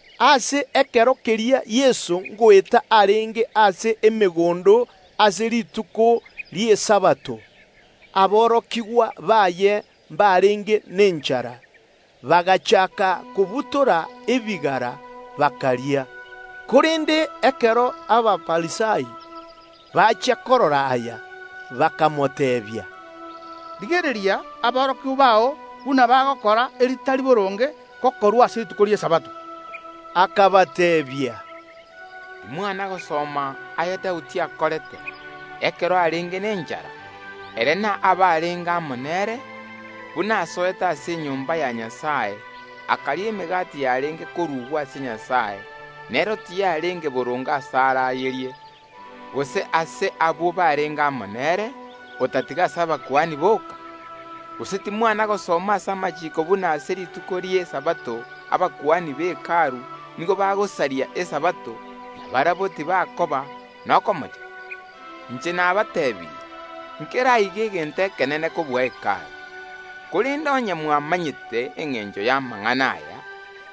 Ase ekero keria Yeso ngoeta arenge gati y’emegondo ase rituko ri’Esabato, aborokigwa baye mbarenge nenchara, bagachaaka kobutora ebigara, bakoria. Korende ekero Abafarisai bachia korora aya, bakamoteebia, “Rigereria, aborokigwa bao buna bagokora eritari boronge gokorwa ase rituko ri’Esabato.” Akabateebia, “Timwana gosoma aya Daudi akorete, ekero arenge nenchara, ere na abarenge amo nere, buna asoete ase enyomba ya Nyasae, akaria emegati yarenge korugwa ase Nyasae, nero tiyarenge boronge asare ayerie, gose ase abwo barenge amo nere, otatiga ase abakuani boka? Gose timwana gosoma ase amachiiko buna ase rituko ri’ Esabato abakuani be Hekalu nigo bagosaria Esabato, na barabwo tibakoba nokomocha? Inche nabateebirie, nkere aiga egento ekenene kobua Hekalu. Korende onye mwamanyete engencho y’amang’ana aya: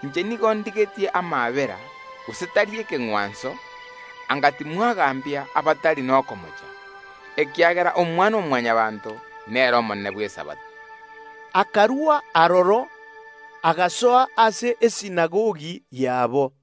Inche nigo ndigetie amaabera, gose tari ekeng’wanso, anga timwagambia abatari nokomocha, ekiagera Omwana-o-Mwanyabaanto nere omonene bw’Esabato.” Akarua aroro, agasoa ase esinagogi yabo.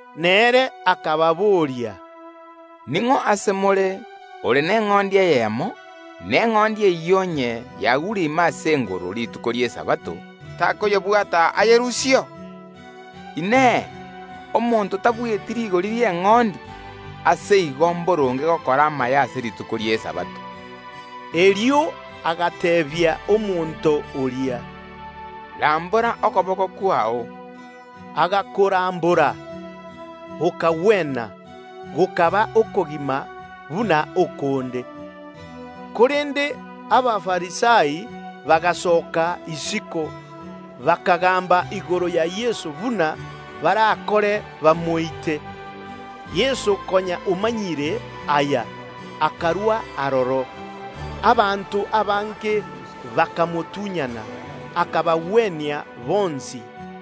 Nere akababoria, “Ning’o ase more ore neng’ondi eyemo, na eng’ondi eyio onye yagure ime ase engoro rituko ri’Esabato, takoyebwata ayerusieo? Inee! Omonto tabueti rigori ri’eng’ondi? Ase igo mboronge gokora amaya ase rituko ri’Esabato.” Erio agateebia omonto oria, “Rambora okoboko kwao.” Agakorambora; gokagwena, gokaba okogima buna okonde. Korende Abafarisai bagasoka isiko, bakagaamba igoro ya Yeso buna barakore bamoite. Ekero Yeso achia komanya aya, akarua aroro. Abanto abange bakamotunyana, akabagwenia bonsi.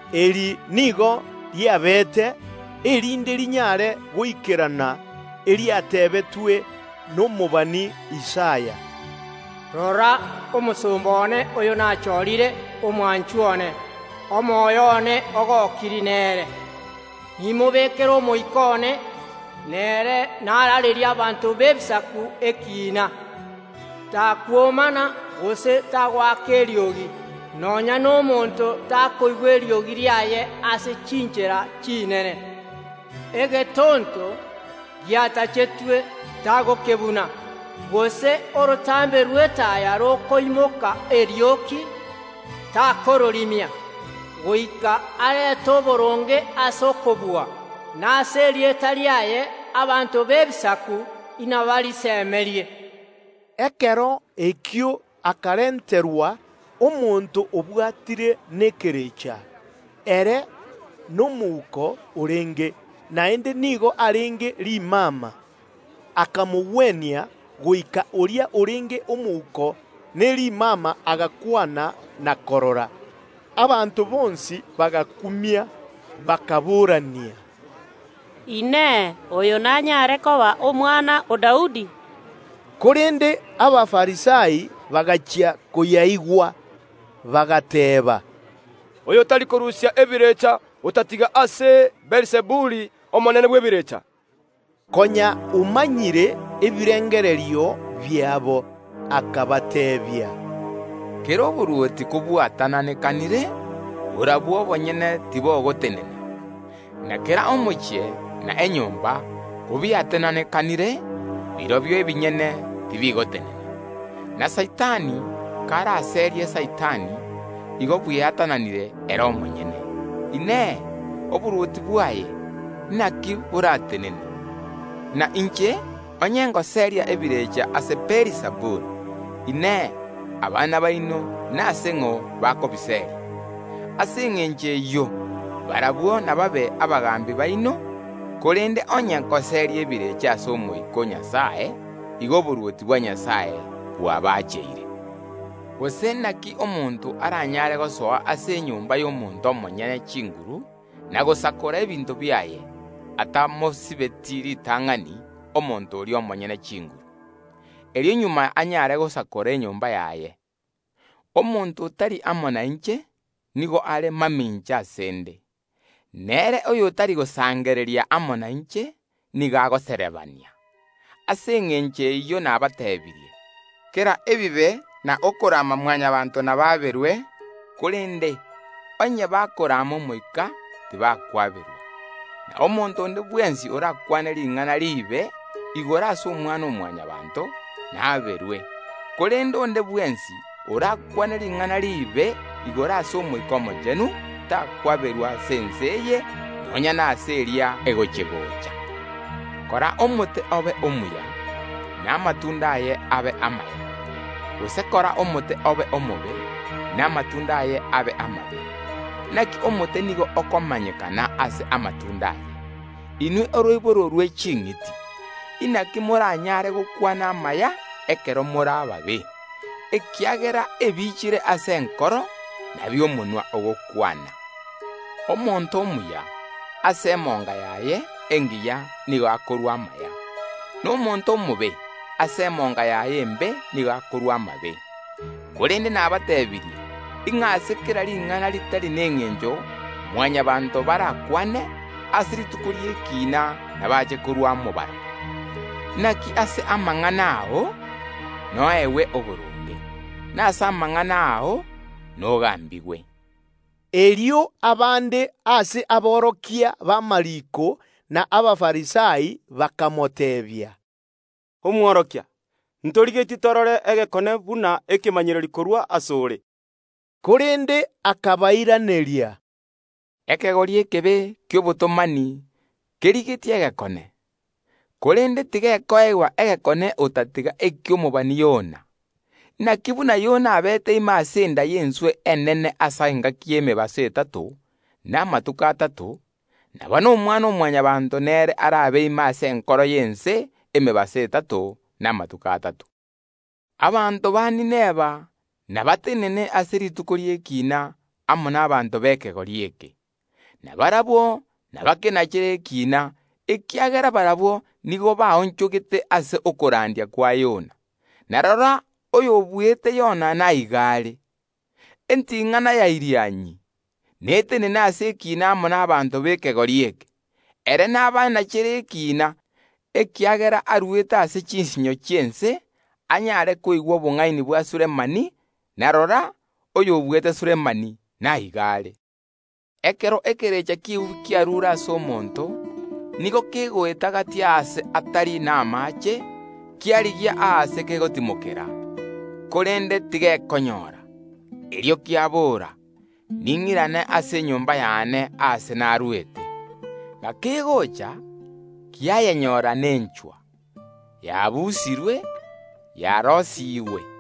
Eri nigo riabeete, erinde rinyare goikerana eriatebetwe nomobani Isaya, “Rora, omosomba one oyo nachoorire, omwanchwa one, omoyo one ogokirie nere. Nimobekere Omoika one, nere naraarerie abanto b’Ebisaku ekiina. Takwomana, gose tagoaka eriogi; nonya nomonto takoigwa eriogi riaye ase chinchera chinene. Egetonto giatachetwe tagokebuna, gose orotambe rw’etaya rokoimoka erioki, takororimia, goika arete oboronge ase okobua; na ase erieta riaye abanto b’Ebisaku mbasemerie.” Ekero ekio akarenterwa omonto obwatire nekerecha; ere nomouko orenge, naende nigo arenge rimama. Akamogwenia, goika oria orenge omouko ne rimama agakwana na korora. Abanto bonsi bagakumia, bakaboorania, “Inee! Oyo nanyare koba omwana o Daudi?” Korende Abafarisai bagachia koyaigwa, bagateeba, “Oyo tari korusia ebirecha otatiga ase chinguru chia Beelizebuli omonene bw’ebirecha.” Yeso Konya omanyire ebirengererio biabo, akabateebia, “Kera oborwoti kobwatananekire borobwo obonyene tibogotenena; na kera omochie na enyomba kobiatananekanire, birobio ebinyene tibigotenena; na Saitani karaserie Saitani, igo bweatananire ere omonyene, Inee, oborwoti bwaye, naki boratenene? Na inche, onye ngoseeria ebirecha ase Beelizebuli, Inee, abana baino nase ng’o bakobiseeria? Ase engencho eyio, barabwo inababe abagaambi baino. Korende onye ngoseeria ebirecha ase Omoika o Nyasae, igo oborwoti bwa Nyasae bwabacheire. Gose inaki omonto aranyare gosoa ase enyomba y’omonto omonyene chinguru na gosakora ebinto biaye, atamosibeti ritang’ani omonto oria omonyene chinguru? Erio magega anyare gosakora enyomba yaye. Omonto otari amo nainche nigo are mamincha ase ’nde. Nere oyotari gosangereria amo nainche nigo agoserebania. Ase engencho eyio nabateebirie, kera ebibe na okorama Mwanyabaanto nabaaberwe, korende onye bagochecheria Omoika tibakwaberwa. Na omonto onde bwensi orakwane ring’ana riibe ase Omwana-o-Mwanyabaanto, naaberwe; korende onde bwensi orakwane ring’ana riibe igoro ase Omoika Omochenu takwaberwa ase ense eye, nonya nase eria egochi‐gocha. “Kora omote obe omuya, na amatunda aye abe amaya; gose kora omote obe omobe, na amatunda aye abe amabe; naki omote nigo okomanyekana ase okwama kwaye. Inwe oroiboro rwe ching’iti! Naki moranyare gokwana amaya ekero more ababe? Ekiagera ebiichire ase enkoro, nabio omonwa ogokwana. Omonto omuya, ase emonga yaye engiya nigo akorua amaya, na omonto omobe, ase emonga yaye embe nigo akorua amabe. Korende nabateebirie, ng’a ase kera ring’ana ritari nengencho Mwanyabaanto barakwane, ase rituko ri’ekiina ’nabache korua omobaro. Inaki ase amang’ana ao noegwe oboronge, na ase amang’ana ao nogaambigwe.” Erio abande ase aborokia b’amariiko na Abafarisai bakamoteebia, “Omwarimu, ntorigetie torore egekone buna ekemanyererio korwa ase ore.” Korende akabairaneria, “Ekegori ekebe ki’obotomani kerigetie egekone, korende tigekoegwa egekone otatiga eki’omobani Yona. Inaki buna Yona abeete ime ase enda y’enswe enene ase engaki y’emebaso etato na amatuko atato, nabo na Omwana‐o‐Mwanyabaanto nere arabe ime ase enkoro y’ense emebaso etato na amatuko atato. Abanto ba Ninawi nabatenene ase rituko ri’ekiina amo n’abanto b’ekegori eke, na barabwo nabakenachere ekiina, ekiagera barabwo nigo baonchogete ase okorandia kwa Yona, na rora, oyobuete Yona naiga are. Enting’ana ya Irianyi netenene ase ekiina amo n’abanto b’ekegori eke; ere nabanachere ekiina, ekiagera arwete ase chinsinyo chi’ense anyare koigwa obong’aini bwa Sulemani, na rora, oyobuete Sulemani naiga are. “Ekero ekerecha ki’eubi kiarure ase omonto, nigo kegoeta gati aase atari namaache, kiarigia aase kegotimokera, korende tigekonyora. Erio kiabora: ‘Ning’irane ase enyomba y’ane aase narwete.’ Gakegocha kiayenyora nenchwa, yaabusirwe, yaroisigwe.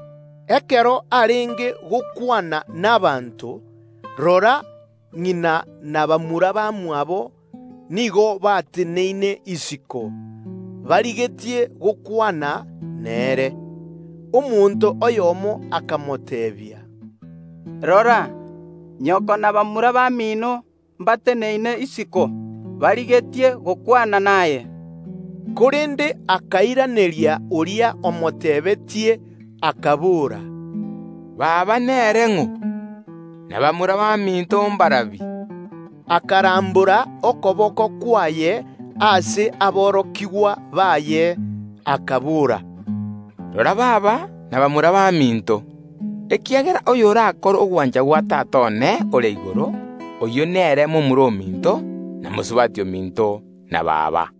Ekero arenge gokwana n’abanto, rora, ng’ina na bamura bamwabo nigo bateneine isiko, barigetie gokwana nere. Omonto oyomo akamoteebia, “Rora, nyoko na bamura bamino mbateneine isiko, barigetie gokwana naye.” Korende akairaneria oria omotebetie, akabora, “Baba nere ng’o? Na bamura baminto mbarabi?” Akarambora okoboko kwaye ase aborokigwa baye, akabora, “Rora baba na bamura baminto! Ekiagera oyorakore ogwancha gwa Tata one ore igoro, oyio nere momura ominto, na mosubati ominto, na baba.”